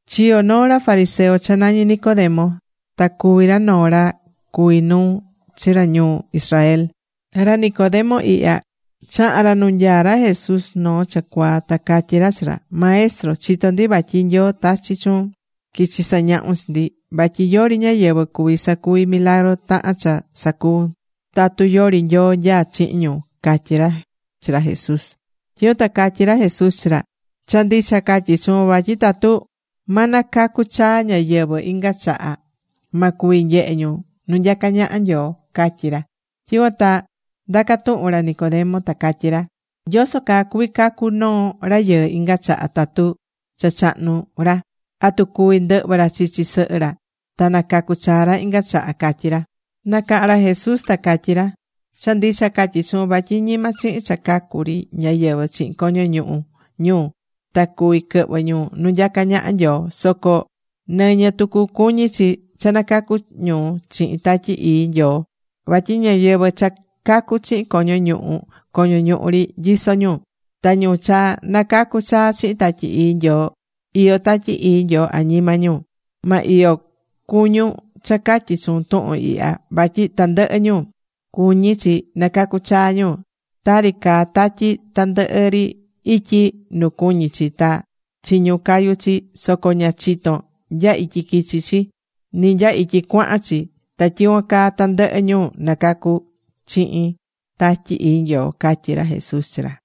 Chiyo̱ noo ra fariseo cha nañí Nicodemo. Ta cuví ra noo ra cuví nuu chi ra ñuu Israel. Ra Nicodemo ihya, chaha̱n ra nu nyaá ra Jesús noo cha cuaa. Ta catyí ra chi ra: ―Maestro, chitó ndi vatyi Nyoo tachi̱ chuun quichi sañahun chi ndi. Vatyi yori ñáyɨvɨ cuvi sacuvi milagru tahan cha sacuvún, tatu yori Nyoo nyaá chihin ñu ―catyí ra chi ra Jesús. Tyicuan ta catyí ra Jesús chi ra: ―Cha ndicha catyí chuun vatyi tatu ma nacacu chaa ñáyɨvɨ inga chaha, ma cuvi nyehe ñu nu nyacá ñaha Nyoo ―catyí ra. Tyicuan ta ndaca̱ tuhun ra Nicodemo ta catyí ra: ―¿Yoso caa cuví cacu noo rayɨɨ inga chaha tatu cha chahnu ra? ¿Atu cuvi ndɨhvɨ ra chichi sɨhɨ ra ta nacacu chaa ra inga chaha? ―catyí ra. Nacaha̱n ra Jesús ta catyí ra: ―Cha ndicha catyí chuun vatyi ñima chihin cha cacu ri ñáyɨvɨ chihin coño ñuhu ñu ta cuví quɨhvɨ ñu nu nyacá ñaha Nyoo. Soco nɨñɨ tucu cuñí chi cha nacacu ñu chihin Tatyi Ii Nyoo. Vatyi ñáyɨvɨ cha cacu̱ chihin coño ñuhu, coño ñuhu ri nyisó ñu. Ta ñu cha nacacu̱ chaa chihin Tatyi Ii Nyoo, iyó Tatyi Ii Nyoo añima ñu. Ma iyo cuñun cha catyí chuun tuhun ihya vatyi tandɨhɨ ñu, cuñí chi nacacu chaa ñu. Tari caá tatyi tandɨhɨ ri ityi nu cuñí chi ta chiñún cayú chi, soco ña chitón nya ityi quichi chi, ni nya ityi cuahan chi; ta tyicuan caa tandɨhɨ ñu nacacu̱ chihin Tatyi Ii Nyoo ―catyí ra Jesús chi ra.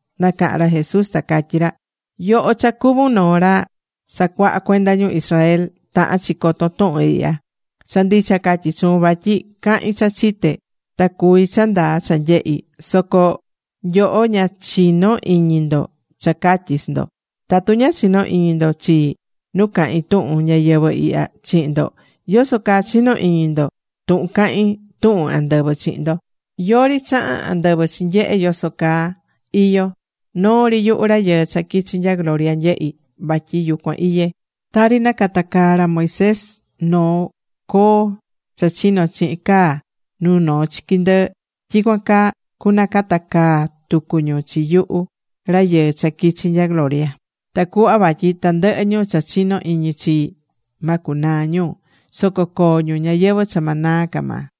Nacaha̱n ra Jesús ta catyí ra: ―Yoho cha cuvún noo ra sacuaha cuenda ñu Israel, tahán chi coton tuhun ihya. Cha ndicha catyí chuun vatyi cahín cha chité ta cuví cha ndaa cha nyehi̱. Soco nyoho ña chinó iñi ndo cha catyí chi ndo. Tatu ña chinó iñi ndo chii nu cahín tuhun ñayɨvɨ̱ ihya chihin ndo, ¿yoso caa chino iñi ndo tu cahin tuhun andɨvɨ chihin ndo? ’Yori chaha̱n andɨvɨ chinyehe̱ yoso caa iyó. Noo ri yuhu Rayɨɨ cha quichi̱ nya gloria nyehí, vatyi yucuan iyé. Tari nacatacaa̱ ra Moisés noo coo cha chino chihin caa nu noo chiqui ndɨɨ, tyicuan caa cunacatacaa tucu ñu chi yuhu Rayɨɨ cha quichi nya gloria, tacuhva vatyi tandɨhɨ ñu cha chinó iñi chii, ma cunaa ñu. Soco coo ñu ñayɨvɨ̱ cha ma naa ca maa.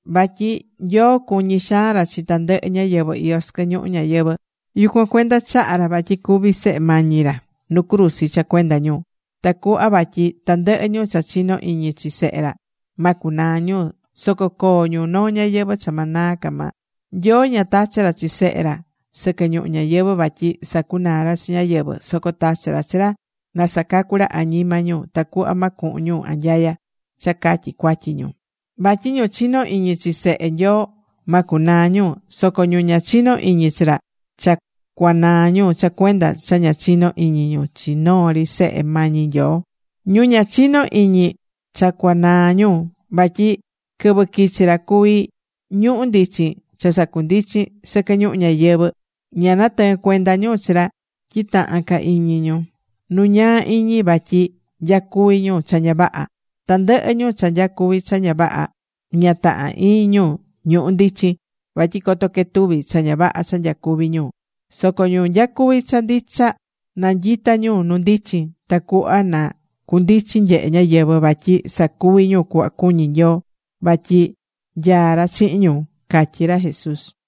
’Vatyi Nyoo cuñí xaan ra chi tandɨhɨ ñáyɨvɨ iyó sɨquɨ ñuhu ñayɨvɨ̱. Yucuan cuenda chaha̱ ra vatyi cúvi Sehe mañi ra nu cruzi cha cuenda ñu. Tacuhva vatyi tandɨhɨ ñu cha chinó iñi chi Sehe ra, ma cunaa ñu, soco coo ñu noo ñayɨvɨ̱ cha ma naa ca maa. Nyoo ña tachi̱ ra chi Sehe ra sɨquɨ ñuhu ñayɨvɨ̱ vatyi sacunaa ra chi ñáyɨvɨ, soco tachi̱ ra chi ra na sacacu ra añima ñu tacuhva ma cuhun ñu anyaya cha catyi cuatyi ñu. ’Vatyi ñu chinó iñi chi Sehe Nyoo ma cunaa ñu, soco ñu ña chinó iñi chi ra, cha cuanaa ñu cha cuenda cha ña chinó iñi ñu chi noo ri Sehe mañi Nyoo. Ñu ña chinó iñi, cha cuanaa ñu. Vatyi quɨvɨ quichi̱ ra cuví ñuhu̱ ndichin cha sacundichín sɨquɨ ñuhu ñayɨvɨ̱, ña natɨɨ̱n cuenda ñu chi ra tyi taha̱n ca iñi ñu nu ñaa iñi vatyi nyacuví ñu cha ña vaha. Tandɨhɨ ñu cha nyacuví cha ña vaha, ña tahán iñi ñu ñuhu̱ ndichin, vatyi coto quetuvi cha ña vaha cha nyacuví ñu. Soco ñu nyacuví cha ndicha, nanyitá ñu nu ndichin tacuhva na cundichin nyehe ñáyɨvɨ vatyi sacuví ñu cuhva cuñí Nyoo vatyi nyaá ra chihin ñu ―catyí ra Jesús.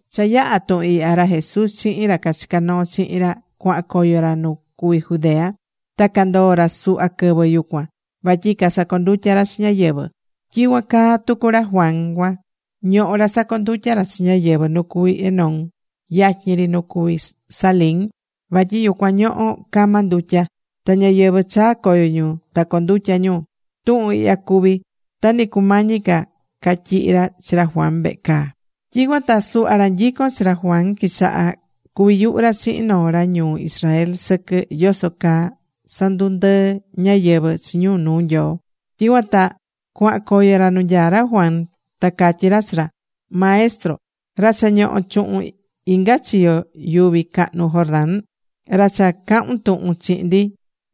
Cha yaha̱ tuhun ihya, ra Jesús chihin ra cachicá noo chihin ra cuahan coyo ra nu cuví Judea. Ta candoo̱ ra suhva quɨvɨ yucuan, vatyi casacondutya ra chi ñáyɨvɨ. Tyicuan caa tucu ra Juan cuan ñohó ra sacondutyá ra chi ñáyɨvɨ nu cuví Enón yatyin ri nu cuví Salim, vatyi yucuan ñohó cama ndutya. Ta ñáyɨvɨ chaá coyo ñu ta condutya ñu. Tuhun ihya cuvi̱ ta ni cumañi ca catyihi ra chi ra Juan vehe caa. Tyicuan ta suhva ra nyicón chi ra Juan quichaha̱ cuvi yuhu ra chihin noo ra ñuu Israel sɨquɨ yoso caa sandundɨɨ ñáyɨvɨ chi ñu nuu Nyoo. Tyicuan ta cuahan coyo ra nu nyaá ra Juan. Ta catyí ra chi ra: ―Maestro, ra cha ñoho̱ chuhun inga chiyo yuvi cahnu Jordán, ra cha cahu̱n tuhun chihin ndi,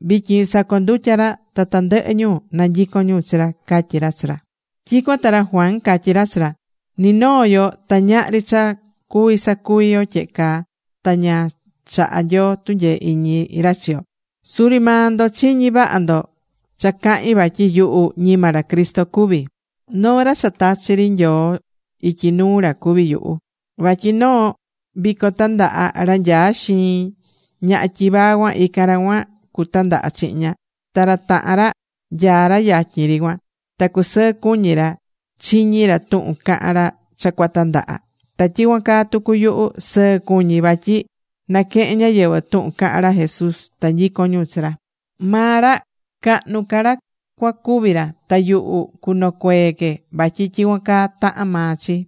vityin sacondutyá ra ta tandɨhɨ ñu nanyicón ñu chi ra ―catyí ra chi ra. Tyicuan ta ra Juan catyí ra chi ra: ―Ni noo yo ta ñahri cha cuví sacuvi yo, tyehe ta ña chahá Nyoo tunyee iñi ra chi yo. Suri maa ndo chiñi̱ vaha ndo cha cahi̱n vatyi yuhu ñima ra Cristo cuví. Noo ra cha tachi̱ ri Nyoo ityi nuu ra cuví yuhu. Vatyi noo vico tandaha, ra nyaá xiin ñaha tyivaa cuan, ican ra cuan cutandaha chihin ña. Ta ra tahan ra nyaá ra yatyin ri cuan. Ta cusɨɨ cuñí ra chiñí ra tuhun cahán ra cha cuatandaha. Ta tyicuan caa tucu yuhu, sɨɨ cuñí vatyi naquehen ñáyɨvɨ tuhun cahán ra Jesús ta nyicón ñu chi ra. Maa ra cahnu ca ra cuacuvi ra. Ta yuhu cunocuee que vatyi tyicuan caa tahán maa chi.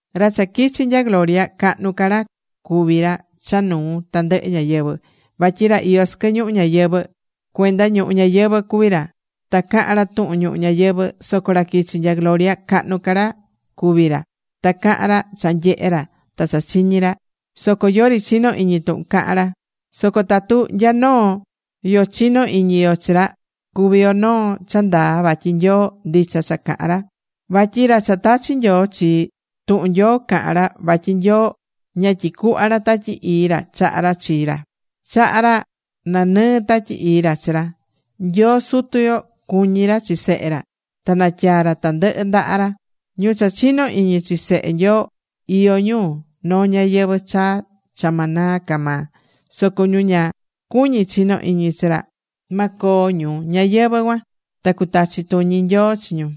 ’Ra cha quichi̱ nya gloria, cahnu ca ra cuví ra cha nuu tandɨhɨ ñáyɨvɨ. Vatyi ra iyó sɨquɨ ñuhu ñayɨvɨ̱, cuenda ñuhu ñayɨvɨ̱ cuví ra. Ta cahán ra tuhun ñuhu ñayɨvɨ̱. Soco ra quichi̱ nya gloria, cahnu ca ra cuví ra. Ta cahán ra cha nyehé ra ta cha chiñí ra, soco yori chinó iñi tuhun cahán ra. Soco tatu nya noo yo chinó iñi yo chi ra, cuví yo noo cha ndaa vatyi Nyoo ndicha cha cahán ra. Vatyi ra cha tachi̱ Nyoo chii, tuhun Nyoo cahán ra vatyi Nyoo ña tyicuhvá ra Tatyi Ii ra chaha̱ ra chi ra. Chaha̱ ra nanɨɨ Tatyi Ii ra chi ra. Nyoo Sutu yo cuñí ra chi Sehe ra. Ta natyaa̱ ra tandɨhɨ ndaha ra. Ñu cha chinó iñi chi Sehe Nyoo, iyó ñu noo ñayɨvɨ̱ chaa cha ma naa ca maa. Soco ñu ña cuñí chino iñi chi ra, ma coo ñu ñayɨvɨ̱ cuan. Ta cutachi tuñi Nyoo chi ñu.